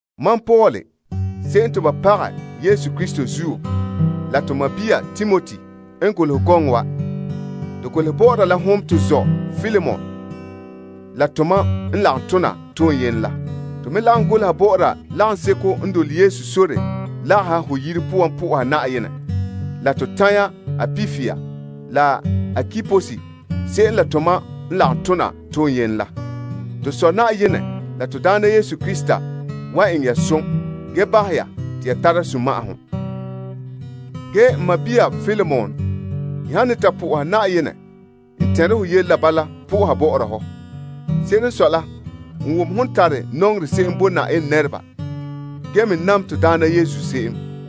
Mam Paul se'em te ba pagɛ Yesu Krista zuo la la to sɔɔn Timoti n golehɛ gɔŋɔ wa. To golehɛ bɔ'ɔra la hom to zɔ' Filemon la tomam n lagom tona toyene la. To me lagom goleha bɔ'ɔra lagaŋseko lagone ho yire poan po'oha Na'ayenɛ la, la to tanya Appia la Arkipus se'em la tomam n lagom tona toyene la. To Sɔ' Na'ayenɛ la to Daana Yesu Krista wan eŋɛ ya som ge bahɛ ya te ya tara sunma'ahom. N sɔɔn Filemon, n han ne ta po'oha Na'ayenɛ, n tɛnre ho yele la bala po'oha bɔ'ɔra hɔ. Se'ere n sɔe la, n wom hon tare nɔŋerɛ se'em bo Na'ayenɛ nɛreba ge me nam to Daana Yesu se'em.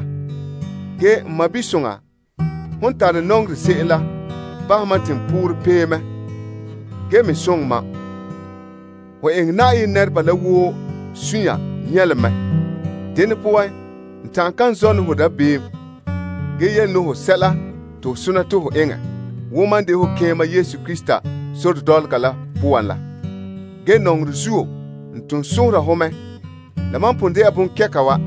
N sɔɔn soŋɔ, hon tare nɔŋerɛ se'em la bahɛ mam te n poorɛ pee mɛ ge me soŋɛ mam. Ho eŋɛ Na'ayenɛ nɛreba la woo suunre nyɛlom mɛ. Dene poan, n ta'an kan zɔne hɔ dabeem ge yele ne ho sɛla te ho sona te ho eŋɛ wo mam de ho keema Yesu Krista sore dɔlɔga la poan la. Ge nɔŋerɛ zuo, n ton sohora ho mɛ. Ge la mam n pon de'a bonkɛka wa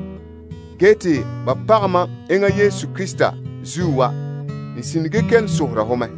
te ba pagɛ mam enŋa Yesu Krista zuo wa, n sine ge kelom sohora ho mɛ.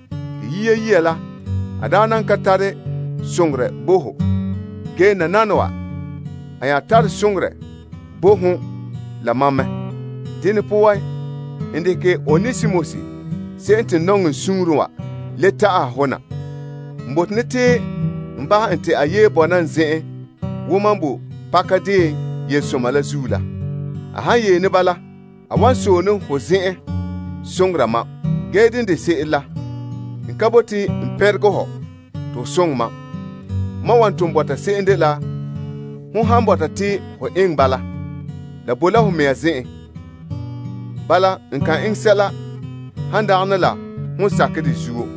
Yia saŋa la, a daa nan ka tare soŋorɛ bo ho. Ge nananawa a nya tare soŋorɛ bo hon la mam mɛ. Dene poan, n dekɛ Onesimus se'em te n nɔŋɛ n suunren wa le ta'aha ho na. N bote ne te n bahɛ en te a yee bɔna n zen'en wo mam boe pakadeen yelesoma la zuo la. A han yee ne bala a wan sɔe ne hon zen'en soŋora mam. Ge dene de se'ere la, n ka bote n pɛnregɛ hɔ te ho soŋɛ mam. Mam wa ton bɔta se'em dela hon han bɔta te ho eŋɛ ba la, la bo la ho mɛŋa zen'en. Bala, n kan eŋɛ sɛla han dagana la hon sakɛ de zuo.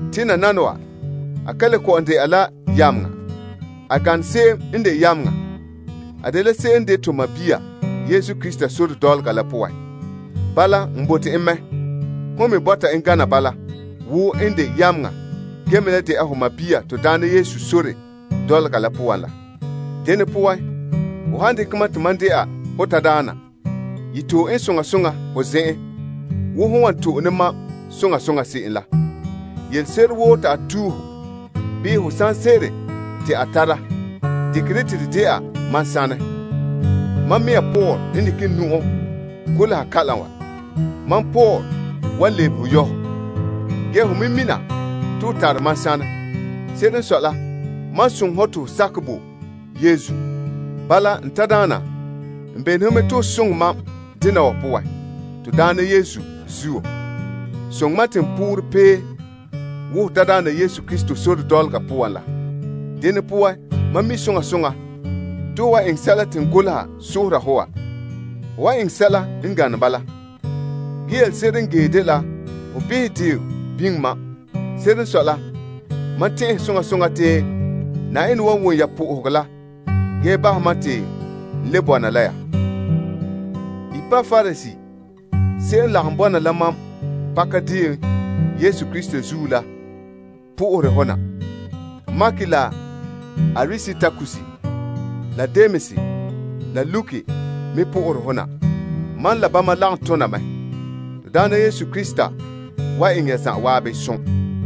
Te nananawa, a ka le kɔ'ɔn dɛna la yameŋa ge a gane se'em n de yameŋa te a dela to sɔɔn. Bala, n bote en mɛ la hon me bɔta en gana bala wo n de yameŋa la ho sɔɔn to Daana la poan la. Dene poan, ho han dekɛ mam te mam dɛna ho tadaana, ye to'e en soŋa soŋa ho zen'en wo hon wan to'e ne mam soŋa soŋa se'em la. Yelese'ere woo te a tue ho bii ho sanse'ere te a tara dekɛ dɛ te de dɛna mam sanɛ. Mam mea Paul n dekɛ n nu'o golehɛ kalam wa: mam Paul wan lebehe yɔ' hɔ. Ge hon me mina te ho tare mam sanɛ. Se'ere n sɔe la, mam n soŋɛ hɔ te ho sakɛ bo Yesu. Bala, n tadaana, n bene ho mɛ te ho soŋɛ mam dena wa poan. To Daana Yesu zuo, soŋɛ mam te n poorɛ pee wo ho tadaana Yesu Krista sore dɔlɔga poan la. Mam mi' soŋa soŋa te ho wan eŋɛ sɛla te n goleha la sohora ho wa. Ge ho wan eŋɛ sɛla n gane bala. Ge yelese'ere n ge dela ho behɛ deo biŋe mam. Se'ere n sɔe la, mam tɛn'ɛhɛ soŋa soŋa te Na'ayenɛ wan wom ya po'ohegɔ la ge bahɛ mam te n le bɔna la ya yɛ'ɛha. Epapras se'em n lagom bɔna la mam pakadeen Yesu Krista zuo la po'ohere ho na. Mark la Aristarkus, la Demas, la Luke me po'ohere ho na. Mam la bama lagom tona mɛ. To Daana Yesu Krista wan eŋɛ ya zan'an som.